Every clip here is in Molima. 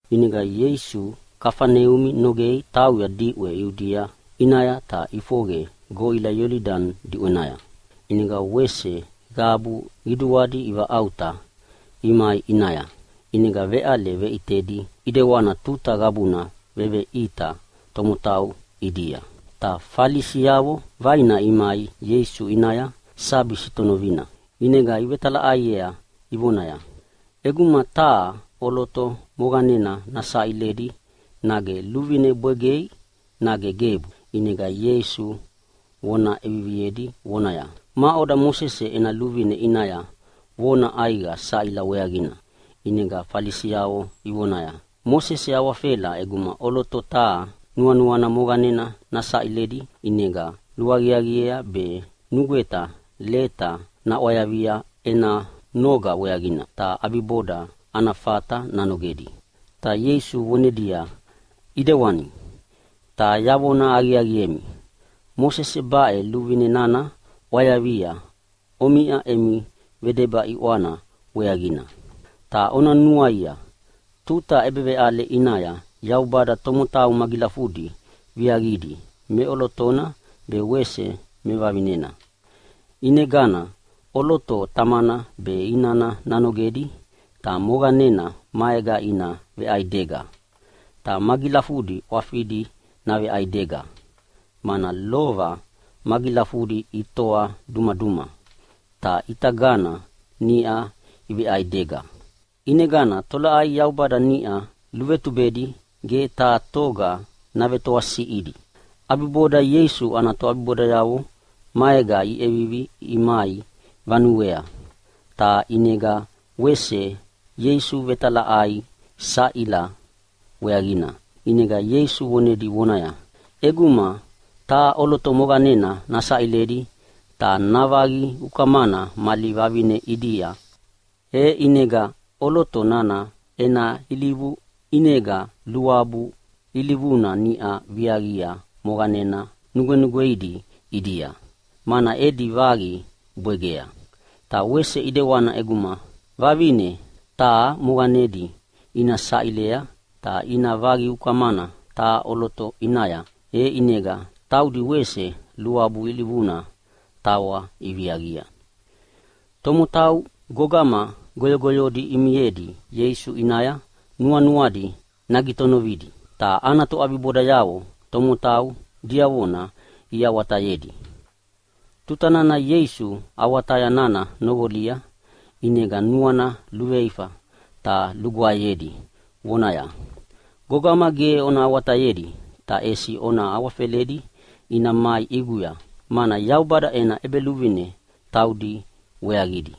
ʼInega Ieisu Kafaneumi nogei tauya diʼwe Iudia ʼinaya ta ʼifoqe goʼila Iolidani diʼwenaya. ʼInega wese qabu qiduadi ivaʼauta imai ʼinaya. ʼInega veʼale veʼitedi ʼidewana tuta qabuna veveʼita tomotau ʼidia. Ta Falisiavo vaina imai Ieisu ʼinaya sabi sitonovina. ʼInega ivetalaʼaiea ivonaya, “ʼEguma taha ʼoloto moqanena navesaʼilidi nage luvine nabwegei nage gebu?” ʼInega Ieisu vona ʼeviviedi vonaya, “Maʼoda Mosese ena luvine ʼinaya vona ʼaiqa saʼila weaqina?” ʼInega Falisiavo ivonaya, “Mosese awafela ʼeguma ʼoloto taha nuanuana moqanena navesaʼilidi, ʼinega luaqiaqiea be nugweta leta naʼwayavia ena noga weaqina, ta ʼabiboda ana fata nanogedi.” Ta Ieisu vonedia, “ʼIdewani. Ta yavona aqiaqiemi, Mosese baʼe luvine nana ʼwayavia omiʼa emi vedeba ʼiʼwana weaqina. “Ta ona nuaia tuta ʼebeveʼale ʼinaya Yaubada tomotau magilafudi viaqidi meʼolotona be wese mevavinena. ʼInegana ʼoloto tamana be inana nanogedi ta moqanena maega ina veʼaidega. Ta magilafudi ʼwafidi naveʼaidega, mana lova magilafudi itoa dumaduma, ta ʼitagana niʼa iveʼaidega. ʼInegana tolaʼai Yaubada niʼa luvetubedi ge taha toga navetoasiʼiedi!” ʼAbiboda Ieisu ana toʼabibodayavo maega iʼevivi imai vanuea. Ta ʼinega wese Ieisu ivetalaʼaiea saʼila weaqina. ʼInega Ieisu vonedi vonaya, “ʼEguma taha ʼoloto moqanena navesaʼilidi ta navaqi ukamana mali vavine ʼidia, e ʼinega ʼoloto nana ena ilivu ʼinega luabu ilivuna niʼa viaqia moqanena nugwenugweidi ʼidia, mana edi vaqi bwegea. Ta wese ʼidewana ʼeguma vavine taha moqanedi ina saʼilea ta ina vaqi ukamana taha ʼoloto ʼinaya, e ʼinega taudi wese luabu ilivuna tawa iviaqia.” Tomotau gogama goyogoyodi imiedi Ieisu ʼinaya nuanuadi nagitonovidi. Ta ana toʼabibodayavo tomotau diavona iawatayedi. Tutana Ieisu awataya nana noqolia, ʼinega nuana luveifa ta lugwaeyedi vonaya, “Gogama ge ona awatayedi ta ʼesi ona awafeledi ina mai ʼiguya, mana Yaubada ena ʼEbeluvine taudi weaqidi.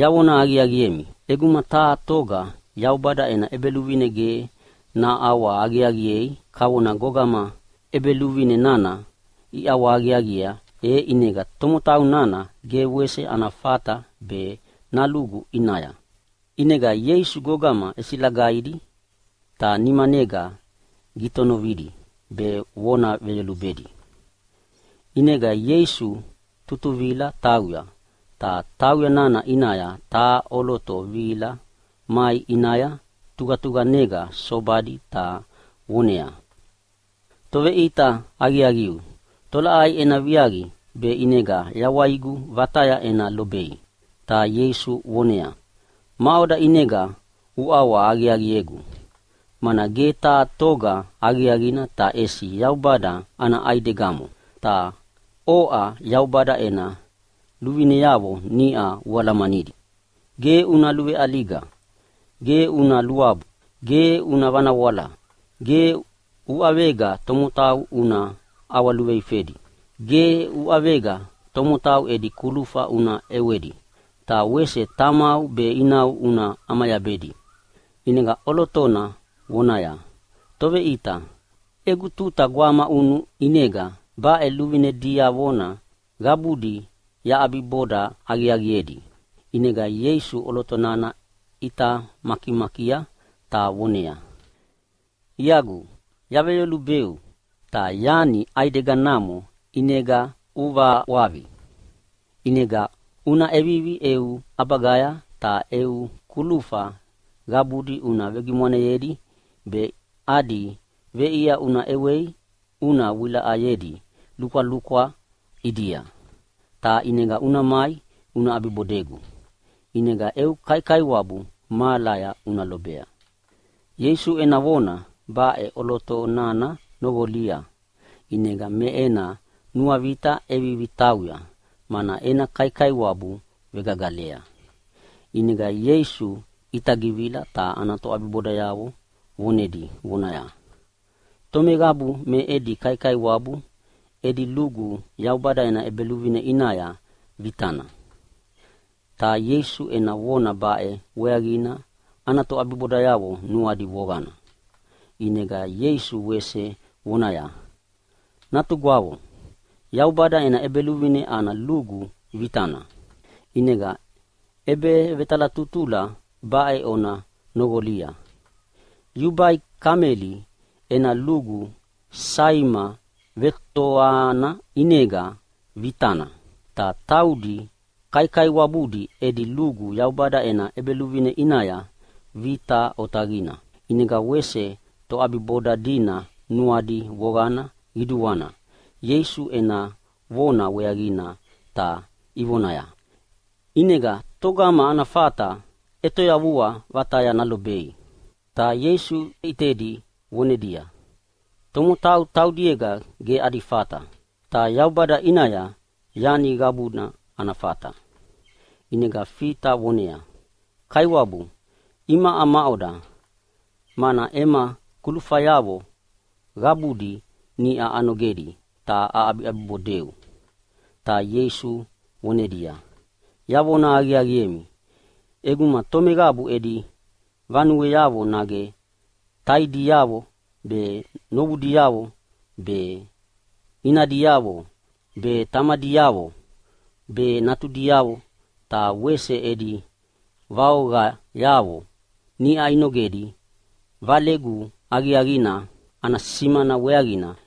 Yavona aqiaqiemi, ʼeguma taha toga Yaubada ena ʼEbeluvine ge naʼawahaqiaqiei kavona gogama ʼebeluvine nana iʼawahaqiaqiea, e ʼinega tomotau nana ge wese ana fata be nalugu ʼinaya.” ʼInega Ieisu gogama ʼesilagaidi ta nimanega gitonovidi be vona veyolubedi. ʼInega Ieisu tutuvila tauya, ta tauya nana ʼinaya taha ʼoloto vihila mai ʼinaya tuqatuqanega sobadi ta voneaya, “Toveʼita aqiaqiu, tolaʼai ena viaqi be ʼinega yawaigu vataya ena lobei?” Ta Ieisu voneaya, “Maʼoda ʼinega uʼawahaqiaqiegu, mana ge taha toga aqiaqina ta ʼesi Yaubada ana ʼaidegamo. Ta oʼa Yaubada ena luvineavo niʼa ualamanidi, Ge una luveʼaliga. Ge una luabu. Ge una vanawala. Ge uʼavega tomotau una ʼawaluveifedi. Ge uʼavega tomotau edi kulufa una ʼewedi. Ta wese tamau be inau una ʼamayabedi.” ʼInega ʼolotona vonaya, “Toveʼita, egu tuta gwamaʼunu ʼinega baʼe luvine diavona qabudi yaʼabiboda aqiaqiedi.” ʼInega Ieisu ʼoloto nana ʼita makimakia ta voneaya, “Iagu yaveyolubeu, ta yani ʼaideganamo ʼinega uvaʼwaqi. ʼInega una ʼevivi eu ʼabagaya ta eu kulufa qabudi una vegimwaneyedi be adi veʼia una ʼewei una vewilaʼayedi lukwalukwa ʼidia, ta ʼinega una mai una ʼabibodegu. ʼInega eu kaikaiwabu mahalaya una lobea.” Ieisu ena vona baʼe ʼoloto nana noqolia, ʼinega me ena nuavita ʼevivi tauya, mana ena kaikaiwabu vegagalea. ʼInega Ieisu ʼitagivila ta ana toʼabibodayavo vonedi vonaya, “Tomeqabu me edi kaikaiwabu edi lugu Yaubada ena ʼEbeluvine ʼinaya vitana.” Ta Ieisu ena vona baʼe weaqina ana toʼabibodayavo nuadi voqana. ʼInega Ieisu wese vonaya, “Natugwavo, Yaubada ena ʼEbeluvine ana lugu vitana. ʼInega ʼebevetalatutula baʼe ona noqolia: Yubai kameli ena lugu saima vetoana ʼinega vitana, ta taudi kaikaiwabudi edi lugu Yaubada ena ʼEbeluvine ʼinaya vita otaqina.” ʼInega wese toʼabiboda dina nuadi voqana qiduana Ieisu ena vona weaqina ta ivonaya, “ʼInega togama ana fata ʼetoyavua vataya nalobei?” Ta Ieisu ʼitedi vonedia, “Tomotau taudiega ge adi fata. Ta Yaubada ʼinaya yani qabuna ana fata.” ʼInega Fita voneaya, “Kaiwabu, imaʼa maʼoda, mana ema kulufayavo qabudi niʼa anogedi ta aʼabiʼabibodeu?” Ta Ieisu vonedia, “Yavona aqiaqiemi, ʼeguma tomeqabu edi vanueavo nage taidiavo be, novudiavo be, inadiavo be, tamadiavo be, natudiavo, ta wese edi vaoqayavo niʼa inogedi Valegu aqiaqina ana simana weaqina,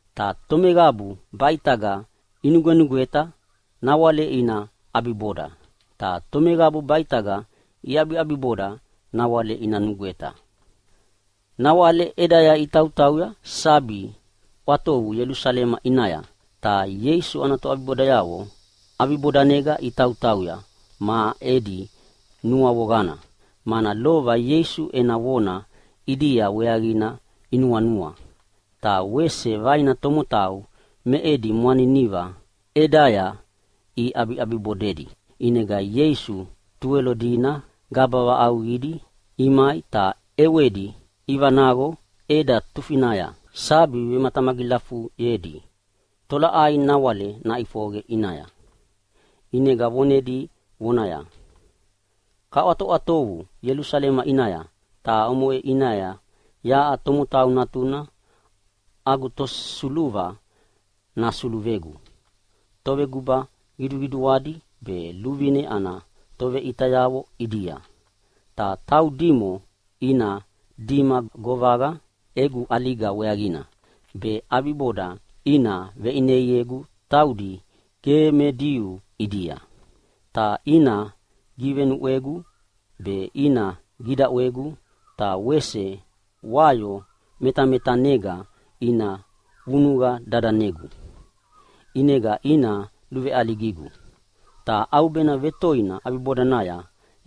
Ta tomeqabu baʼitaga inugwenugweta nawale ina ʼabiboda, ta tomeqabu baʼitaga iʼabiʼabiboda nawale ina nugweta.” Nawale ʼedaya itautauya sabi ʼwatovu Ielusalema ʼinaya, ta Ieisu ana toʼabibodayavo ʼabibodanega itautauya me edi nuavoqana, mana lova Ieisu ena vona ʼidia weaqina inuanua. Ta wese vaina tomotau me edi mwaniniva ʼedaya iʼabiʼabibodedi. ʼInega Ieisu Tuwelo dina gaba vaʼauqidi imai ta ʼewedi ivanaqo ʼeda tufinaya sabi vematamagilafuyedi tolaʼai nawale naʼifoqe ʼinaya. ʼInega vonedi vonaya, “Kaʼwatoʼwatovu Ielusalema ʼinaya, ta omoʼe ʼinaya yaʼa Tomotau Natuna agu tosuluva nasuluvegu toveguba qiduqiduadi be luvine ana toveʼitayavo ʼidia. Ta taudimo ina dima govaqa egu ʼaliga weaqina, be ʼabiboda ina veʼineiegu taudi ge me Diu ʼidia. Ta ina givenuʼwegu be ina gidaʼwegu ta wese wayo metametanega ina vunuqa dadanegu, ʼinega ina luveʼaligigu. Ta ʼaubena toi ʼabibodanaya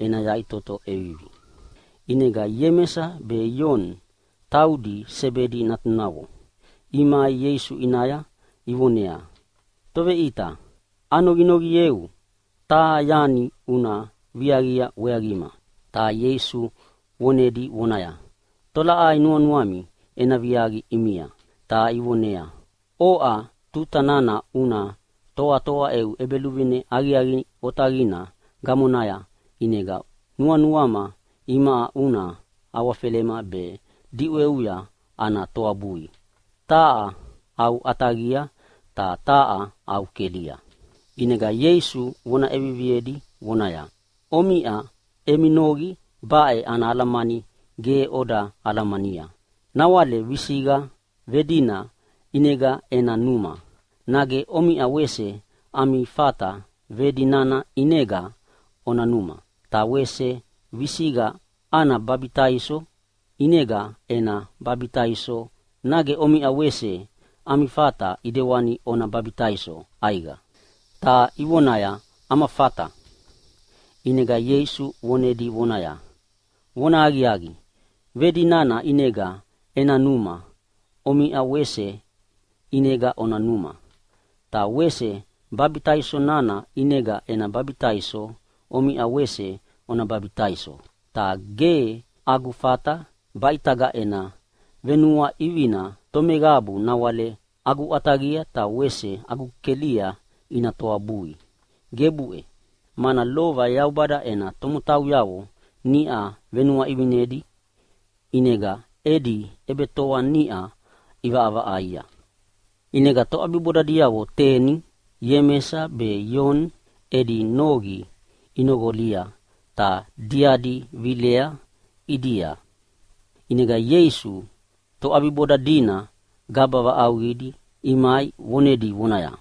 ena yaʼitoto ʼevivi.” ʼInega Iemesa be Ioni, taudi Sebedi natunavo, imai Ieisu ʼinaya ivoneaya, “Toveʼita, anoqinoqieu taha yani una viaqia weaqima.” Ta Ieisu vonedi vonaya, “Tolaʼai nuanuami ena viaqi ʼimia?” Ta ivoneaya, “Oʼa tuta nana una toatoa eu ʼEbeluvine aqiaqi otaqina gamonaya ʼinega nuanuama imaʼa una awafelema be diʼweuya ana toabui, taha au ʼataqia ta taha au kelia.” ʼInega Ieisu vona ʼeviviedi vonaya, “Omiʼa emi noqi baʼe ana alamani ge oda alamania. Nawale visiqa vedina ʼinega ena numa, nage omiʼa wese ami fata vedi nana ʼinega ona numa? Ta wese visiqa ana babitaiso ʼinega ena babitaiso, nage omiʼa wese ami fata ʼidewani ona babitaiso ʼaiqa?” Ta ivonaya, “Ama fata!” ʼInega Ieisu vonedi vonaya, “Vonahaqiaqi, vedi nana ʼinega ena numa omiʼa wese ʼinega ona numa. Ta wese babitaiso nana ʼinega ena babitaiso omiʼa wese ona babitaiso. Ta ge agu fata baʼitaga ena venuaʼivina tomeqabu nawale agu ʼataqia be wese agu kelia ina toabui, gebuʼe! Mana lova Yaubada ena tomotauyavo niʼa venuaʼivinedi ʼinega edi ʼebetoa niʼa ʼivaʼavaʼaia.” ʼInega toʼabibodayavo teni Iemesa be Ioni edi noqi inoqolia ta diadi vilea ʼidia. ʼInega Ieisu toʼabiboda dina gaba vaʼauqidi imai vonedi vonaya,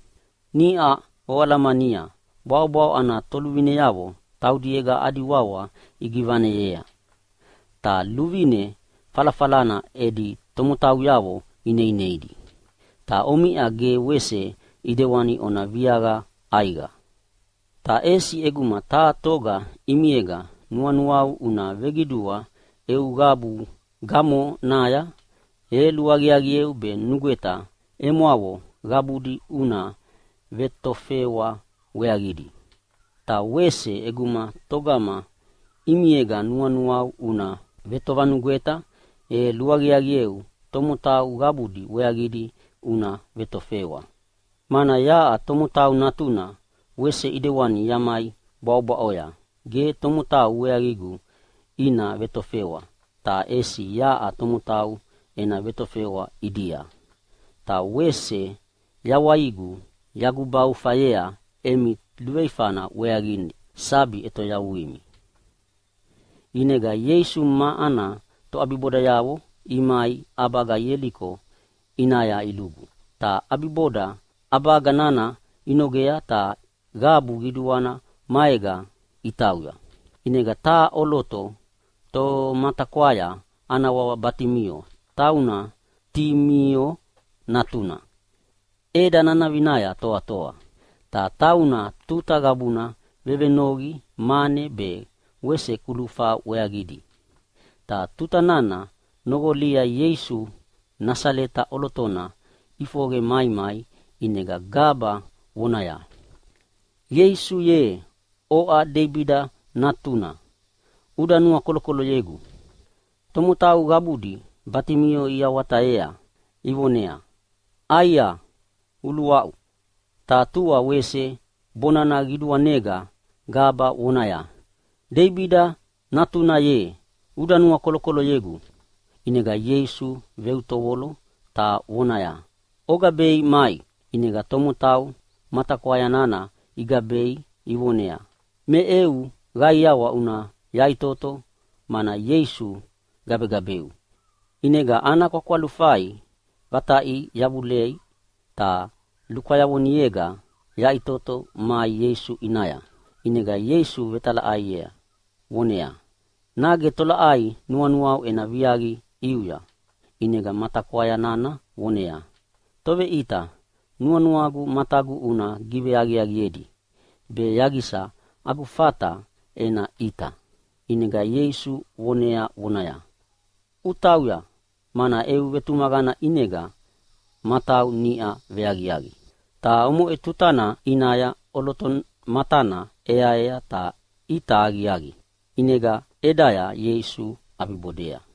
“Niʼa oalamania bwaʼobwaʼo ana toluvineavo taudiega adi wawa igivaneyea, ta luvine falafalana edi tomotauyavo ineineidi. Ta omiʼa ge wese ʼidewana ona viaqa ʼaiqa. Ta ʼesi ʼeguma taha toga ʼimiega nuanuau una veqidua eu qabu gamonaya, e luaqiaqieu be nugweta emwavo qabudi una vetofewa weaqidi. Ta wese ʼeguma togama ʼimiega nuanuau una vetovanugweta e luaqiaqieu tomotau qabudi weaqidi una vetofewa. Mana yaʼa Tomotau Natuna wese ʼidewana yamai bwaʼobwaʼoya gebu tomotau weaqigu ina vetofewa, ta ʼesi yaʼa tomotau ena vetofewa ʼidia. Ta wese yawaigu yagubaufayea emi luveifana weaqina sabi ʼetoyavuimi.” ʼInega Ieisu ma ana toʼabibodayavo imai ʼabaga Ieliko ʼinaya ilugu. Ta ʼabiboda ʼabaga nana inogea ta qabu qiduana maega itauya. ʼInega taha ʼoloto tomatakwaya ana wawa Batimio, tauna Timio natuna, ʼeda nanavinaya toatoa. Ta tauna tuta qabuna vevenoqi mane be wese kulufa weaqidi. Ta tuta nana noqolia Ieisu Nasaleta ʼolotona ʼifoqe maimai ʼinega gaba vonaya, “Ieisu ye, oʼa Deibida natuna, uda nuakolokoloyegu!” Tomotau qabudi Batimio iawatayea ivoneaya, “ʼAia, uluaʼu!” Ta tua wese bonana qiduanega gaba vonaya, “Deibida natuna ye, uda nuakolokoloyegu!” ʼInega Ieisu veutovolo ta vonaya, “Ogabei mai!” ʼInega tomotau matakwaya nana igabea ivoneaya, “Me eu qaiawa una yaʼitoto mana Ieisu gabegabeu.” ʼInega ana kwakwalufai vataʼia yavulei, ta lukwayavonega yaʼitoto mai Ieisu ʼinaya. ʼInega Ieisu vetalaʼaiea vonaya, “Nage tolaʼai nuanuau ena viaqi ʼiuya?” ʼInega matakwaya nana vonaya, “Toveʼita, nuanuagu matagu una giveaqiaqiedi be yaqisa agu fata ena ʼita.” ʼInega Ieisu vonea vonaya, “Una tauya, mana eu vetumaqana ʼinega matau niʼa veaqiaqi.” Ta omoʼe tutana ʼinaya ʼoloto matana ʼeaea ta ʼita aqiaqi, ʼinega ʼedaya Ieisu ʼabibodea.